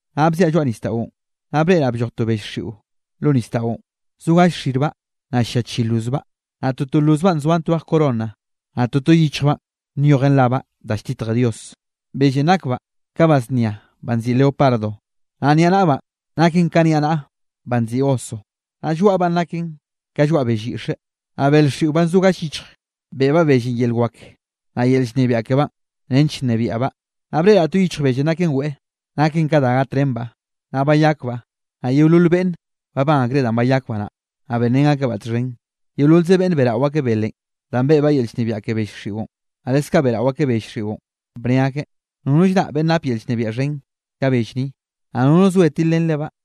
Naꞌ bziaꞌ lloaꞌ nisdaꞌon, naꞌ breꞌraꞌ blloj to bell xiꞌo lo nisdaꞌon. Zo galle yichjbaꞌ, naꞌ llia chi lozbaꞌ, naꞌ toto lozbaꞌ nzoan twej corona. Naꞌ toto yichjbaꞌn nyojen rabaꞌ da lltitje Dios. Bellenꞌ nakbaꞌ ka ba znia banꞌ nziꞌi leopardo, naꞌ niaꞌnaꞌbaꞌn naken ka niaꞌnaꞌa banꞌ nziꞌi oso, naꞌ lloaꞌbaꞌn naken ka lloaꞌ bell yiꞌxe. Naꞌ bel xiꞌo banꞌ zo gall yichj, beꞌbaꞌ bellenꞌ yel wak, naꞌ yel llnebiaꞌ kebaꞌn nench bnebiaꞌbaꞌ. Naꞌ breꞌraꞌ to yichj bellenꞌ naken weꞌe, naken ka da gatrenbaꞌ, naꞌ bayakbaꞌ. Naꞌ yeolol beꞌnne babán akreꞌ danꞌ bayakbaꞌ naꞌ, naꞌ benrén akebaꞌ txhen. Yeololze beꞌnn beꞌrao akeꞌ belenꞌ danꞌ beꞌbaꞌ yel llnebiaꞌ ke bell xiꞌon, naꞌ leskaꞌ beꞌrao akeꞌ bell xiꞌon, bne ake: —Nono llraꞌ beꞌnn nape yel llnebiaꞌ xhen ka bell ni, naꞌ nono soe tilrén lebaꞌ.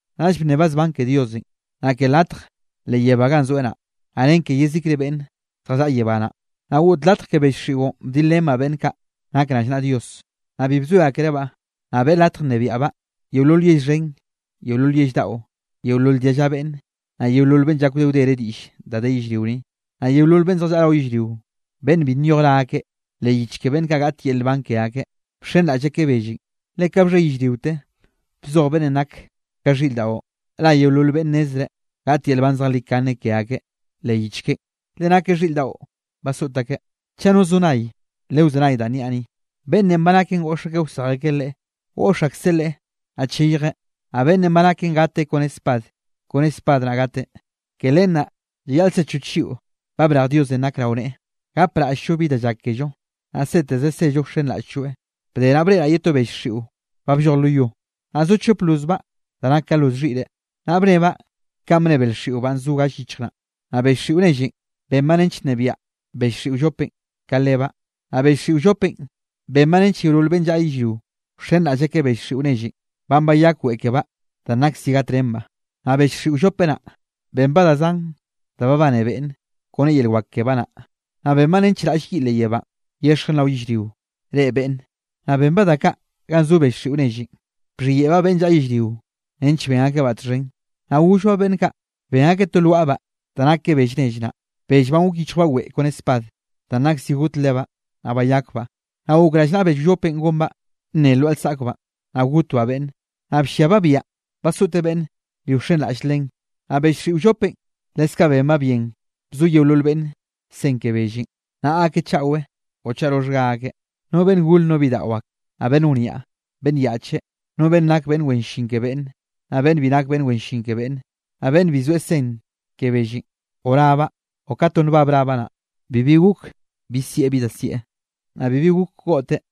Naꞌll bnnebaꞌ zban ke Diosenꞌ, naꞌ ke latj leꞌ yebánꞌ ganꞌ zoeꞌ naꞌ, naꞌ ren ke yezikre beꞌnne zjallaꞌa yebá naꞌ. Naꞌ goꞌt latj ke bell xiꞌon bdilrenbaꞌ beꞌnn kaꞌ nak rallnaꞌa Dios, naꞌ bi bzoe akerebaꞌ. Naꞌ beꞌe latj bnebiaꞌbaꞌ yeolol yell xhen, yeolol yell daꞌo, yeolol dialla beꞌnn, naꞌ yeolol beꞌnn llak wde wdere diꞌll da de yellrio ni. Naꞌ yeolol beꞌnn zjallaꞌa rao yellrio, beꞌnn bi nyoj ra akeꞌ leꞌ yich ke beꞌnn kaꞌ gaꞌt yel nban ke akeꞌ, bxenraꞌll akeꞌ bellenꞌ, le ka bxhe yellriote bzoj beꞌnnenꞌ nak ka xhiꞌr dao, ra yeolol beꞌnn nnezreꞌ gaꞌt yel nban zejlikane ke akeꞌ leꞌ yich keꞌen, leꞌe nakeꞌ xhiꞌr daꞌon basoꞌt akeꞌ. Chaꞌ no zo nay, lewzenay danꞌ niaꞌ ni. Beꞌnnenꞌ ba naken goꞌx akeꞌ wsej akeꞌ leꞌe, goꞌx akseꞌ leꞌe naꞌ cheyjeꞌ. Naꞌ beꞌnnenꞌ ba naken gateꞌ kone spad, kone spad naꞌ gateꞌ. Ke len naꞌ llayaꞌl sechoch lliꞌo ba brej Diosenꞌ nak rao neꞌe, gapraꞌll-llo bi da llak kello, naꞌ seteze sello wxenraꞌll-lloeꞌ. Bde naꞌ breꞌraꞌ ye to bell xiꞌon ba blloj lo yo. Naꞌ zo chop lozbaꞌ da nak ka loz xhiꞌre, naꞌ bnnebaꞌ kanꞌ bnne bel xiꞌo banꞌ zo gall yichj naꞌ. Naꞌ bell xiꞌo nellenꞌ benbaꞌ nench nnebiaꞌ bell xiꞌo wllopenꞌ ka lebaꞌ, naꞌ bell xiꞌo wllopenꞌ benbaꞌ nench yeolol beꞌnn llaꞌa yellrio, wxenraꞌll akeꞌ bell xiꞌo nellenꞌ banꞌ bayak weꞌe kebaꞌ danꞌ nak zi gatrenbaꞌ. Naꞌ bell xiꞌo wllope naꞌ, benbaꞌ da zan da babane beꞌnne kone yel wak kebaꞌ naꞌ, naꞌ benbaꞌ nench raꞌll yiꞌ leꞌ yebánꞌ, yexjen rao yellrio, reꞌe beꞌnne. Naꞌ benbaꞌ da kaꞌ ganꞌ zo bell xiꞌo nellenꞌ, bxhiyeꞌbaꞌ beꞌnn llaꞌa yellrio nench ben akebaꞌ txhen. Naꞌ gollbaꞌ beꞌnn kaꞌ, ben akeꞌ to lwaꞌbaꞌ da nak ka bell nell naꞌ, bell banꞌ gok yichjbaꞌ weꞌe kone spad, danꞌ nak zi got lebaꞌ, naꞌ bayakbaꞌ. Naꞌ gok rallnaꞌa bell wllopenꞌ gonbaꞌ nne lwaꞌa lsaꞌkbaꞌn, naꞌ gokte bnnen, naꞌ blliabaꞌ biaꞌa basoꞌte beꞌnne bi wxenraꞌll len. Naꞌ bell xiꞌo wllopenꞌ leskaꞌ benbaꞌ bien bzo yeolol beꞌnne sen ke bellenꞌ, naꞌa akeꞌ chaꞌwe o chaꞌ roxhga akeꞌ, no beꞌnn gore no bidaꞌo ak, naꞌ beꞌnn wniaꞌ, beꞌnn yaꞌche, no beꞌnn nak beꞌnn wen llin ke beꞌnne, naꞌ beꞌnn bi nak beꞌnn wen llin ke beꞌnne. Naꞌ beꞌnn bi soeꞌ sen ke bellenꞌ o rabaꞌ o ka to nbab rabaꞌ naꞌ, bibi gok bi sieꞌ bi da sieꞌ, naꞌ bibi gok goꞌte.